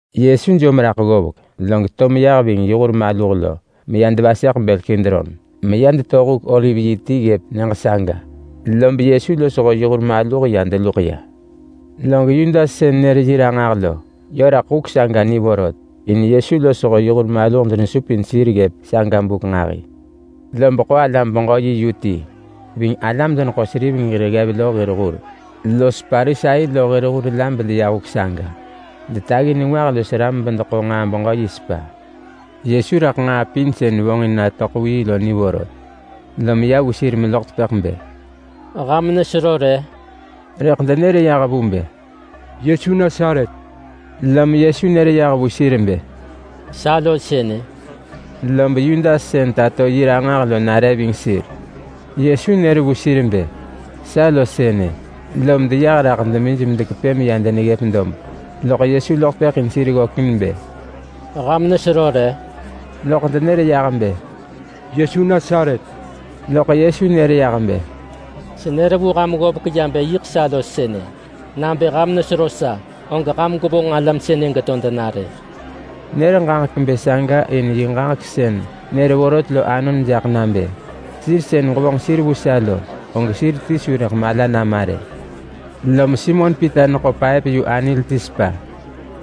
Yesu jom raḳ ggovek log to meya ving yi hur maluh meya devaseḳ bël Kidron, meya deto huk oliv yi ti ggëp nyëġ saga. Lob Yesu losho yi hur maluh ya deluḳ ya. Log Yudas sën nër yi ranġah lo, yö raḳ huk saga ni vorot, in Yesu losho yi hur maluh denesupin sir ggëp saga buk nġahi. Lob ḳo alam-beġö-yi yu ti ving alam-deneḳo-seriveng hir ggev lo hir hur los Parisai lo hir hur la bedeya huk saga. Detaggi nengwah los ram bedeḳo nġaa-beġö-yi sepa. Yesu raḳ nġaa pin sën vonġin natöḳ vu yi lo ni vorot, lom ya vu sir meloḳ tepëḳ bë, “Ham nesero re?” Rëḳ denër yah vu bë, “Yesu Nasaret!” Lom Yesu nër yah vu sir bë, “Sa lo sënë!” Lob Yudas sën tato yi ranġah lo nare ving sir. Yesu nër vu sir bë, “Sa lo sënë!”, lom deyah raḳ demij medekepë meya deneggëp dob. Lom Yesu loḳ tepëḳ in sir ggökin bë, “Ham nesero re?” Loḳ denër yah bë, “Yesu Nasaret!” Loḳ Yesu nër yah bë, “Senër vu ham ggovek ya bë yiḳ sa lo sënë! Nabë ham nesero sa, og ham gwevonġ alam sënë geto dena.” Nër bë saga in yi ġaġek sën nër vorot lo anon jaḳ nabë, “Sir sën ġevonġ sir vu sa lo, og sir ti su rëḳ mala nama rë.” Lom Simon Pita neḳo paëp-yu-anil ti sepa,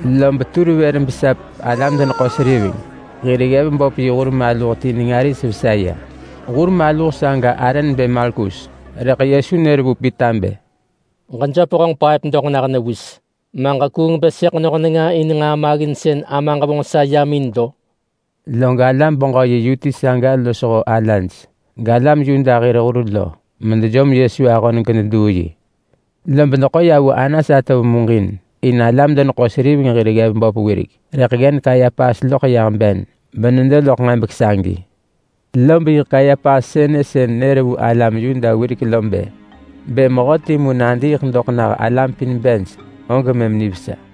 lob tur vër besap alam-deneḳo-seriveng hir ggev böp yi hur maluh ti nenga ris vesa ya. Hur maluh saga arë nebë Malkus. Rëḳ Yesu nër vu Pita bë, “Ġejöp honġ paëp doḳ nah newis. Ma ġekuung bë sëḳ noh nenga in nġaa maggin sën Amaġ vonġ sa yam in lo?” Log alam-beġö-yi yu ti saga losho alaj, galam Yuda hir hur lo, medejom Yesu ahon gededuu yi. Lob deḳo ya vu Anas atov muġin. In alam-deneḳo-seriveng hir ggev böp wirek, rëḳ ggen Kayapas loḳ yah ben benedo loḳ nġebek sagi. Lob yiḳ Kayapas sënë sën nër vu alam Yuda wirek lo bë, “Bë mehö timu nadiiḳ doḳ nah alam pin bej, og mëm nivesa.”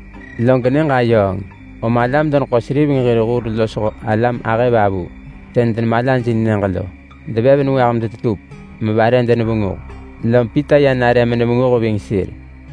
Log nyëġ ayööng, om alam-deneḳo-seriveng hir hur losho alam ahëvavu sën denemalajin nyëġ lo devev nengwah medetetup mevare denevenguh. Lom Pita ya nare menevenguh ving sir.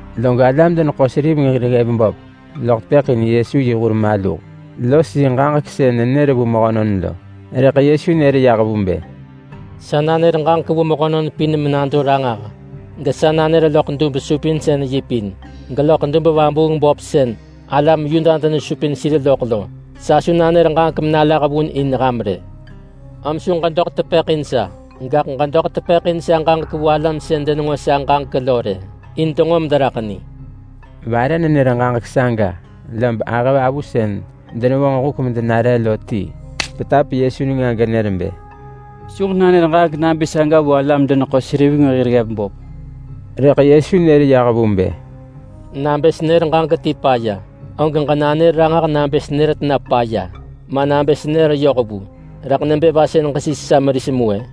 Log alam-deneḳo-seriveng hir ggev böp loḳ tepëḳ in Yesu yi hur maluh los yi ġaġek sën nenër vu mehönon lo. Rëḳ Yesu nër yah vu bë, “Sa nanër ġaġek vu mehönon pin menado ranġah, gesa nanër loḳ dub-supinsën-yi pin, geloḳ dub-vabuung-böp sën alam Yuda denesupin sir loḳ lo. Sa su nanër ġaġek menalah vun in ham rë. Om su ġedoḳ tepëḳ in sa, gaḳ ġedoḳ tepëḳ in sa ġaġek vu alam sën denenġo sa ġaġek lo rë, in denġo mederaḳ ni.” Vare nenër ġaġek saga, lob ahëvavu sën denevonġ huk medenare lo ti petap Yesu nenga genër bë, “Su ġenanër ġaġek nabë saga vu alam-deneḳo-seriveng hir ggev böp!” Rëḳ Yesu nër yah vu bë, “Nabë senër ġaġek ti paya, og ġenanër ranġah nabë senër tena paya. Ma nabë senër yoh vu, rëḳ nebë va sën ġesis sa meris mu-ë?”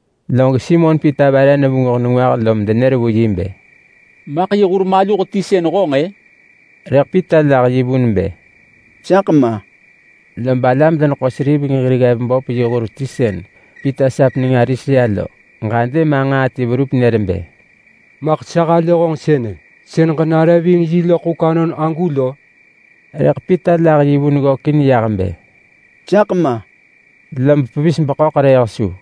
Log Simon Pita vare nevenguh nengwah lom denër vu yi bë, “Maḳ yi hur maluh ti sën honġ-ë?” Rëḳ Pita lah yi vun bë, “Saḳ ma!” Lob alam-deneḳo-seriveng hir ggev böp yi hur ti sën Pita sap nenga ris ya lo ġadë ma nġaa ti verup nër bë, “Maḳ sa halë honġ sënë. Sën ġenare ving yi loḳ huk anon agu lo?” Rëḳ Pita lah yi vun ggökin yah bë, “Saḳ ma!”, lob pevis beḳöḳrëëh su.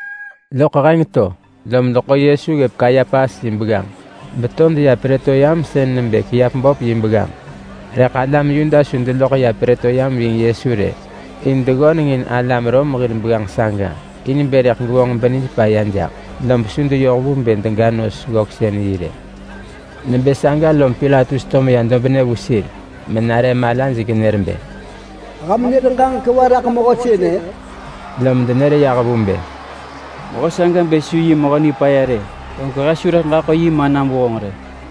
Loḳ heng to, lom deḳo Yesu ggëp Kayapas yi begganġ beto deya Prëtoryam (sën nebë kiap böp yi begganġ). Rëḳ alam Yuda su deloḳ ya Prëtoryam ving Yesu rë, in deneggöneng in alam Rom hir begganġ saga in bë rëḳ gevonġ benij paya jaḳ, lob su deyoh vu bë dega nos-ggöksën-yi rë. Nebë saga lom Pilatus to meya dobnë vu sir menare malaj genër bë, “Ham nër ġaġek va raḳ mehö sënë?” Lom denër yah vu bë, “Mehö saga bë su yi mehö nipaya rë, og he su rëḳ ġaḳo yi manam vu honġ rë!”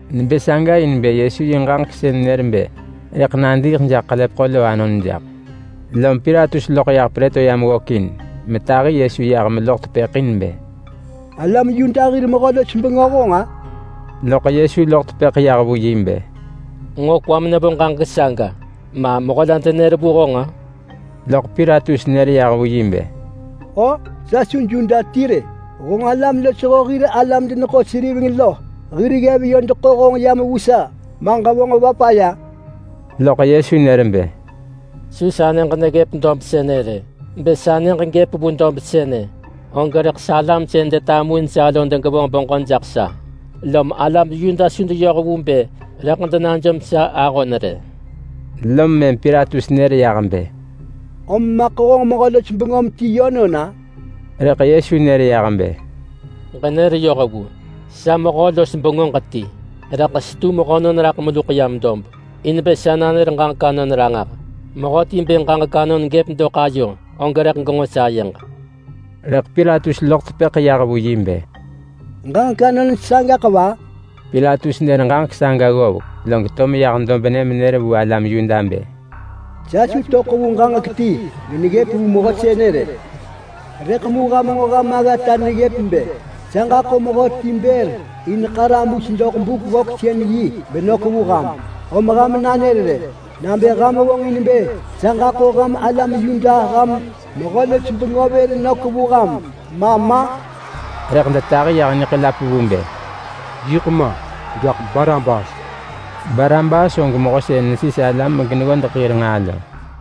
Nebë saga in bë Yesu yi ġaġek sën nër bë rëḳ nadiiḳ jaḳ ḳelepeḳo lo anon jaḳ. Lom Pilatus loḳ yah Prëtoryam ggökin metahi Yesu yah meloḳ tepëḳ in bë, “Alam Yuda hir mehö-los-bengö honġ-a?” Loḳ Yesu loḳ tepëḳ yah vu yi bë, “Nġo kwam nevo ġaġek saga, ma mehö la denër vu honġ-a?” Loḳ Pilatus nër yah vu yi bë, “O! Sa su Yuda ti rë! Honġ alam losho hir alam-deneḳo-seriveng lo hir ggev yö deḳo honġ yam vu sa. Ma ġevonġ va paya?” Loḳ Yesu nër bë, “Su sa nyëġ neggëp dob sënë rë. Bë sa nyëġ gëp vu dob sënë, og rëḳ salam sën detamuin sa lo degevonġ beġö jaḳ sa, lom alam Yuda su deyoh vu bë rëḳ denajom sa ahon rë.” Lom mëm Pilatus nër yah bë, “Om maḳ honġ mehö-los-bengöm ti yönon-a?” Rëḳ Yesu nër yah bë, “Ġenër yoh vu! Sa mehö-los-bengöġ ti, rëḳ setu mehönon meluḳ yam dob in bë sa nanër ġaġek anon ranġah. Mehöti bë ġaġek anon gëp doḳ ayo, og rëḳ genġo sayeġ.” Rëḳ Pilatus loḳ tepëḳ yah vu yi bë, “Ġaġek anon sagaḳ va?” Pilatus nër ġaġek saga ggovek, log to meyah dobnë menër vu alam Yuda bë, “Sa su töḳ vu ġaġek ti geneggëp vu mehö sënë rë. Rëḳ mu ham nġo ham aggata neggëp bë sa ġaḳo mehöti bër in ḳarabus doḳ Buk-ggöksën-yi benök vu ham. Om ham nanër rë, nabë ham vonġin bë sa ġaḳo ham alam Yuda ham mehö-los-bengö vër vu ham ma ma?” Rëḳ detahi yah niḳelap vu bë, “Yiḳ ma! Gaḳ Barabas!” Barabas og mehö sën nesis alam geneggodeḳ hir nġaa lo.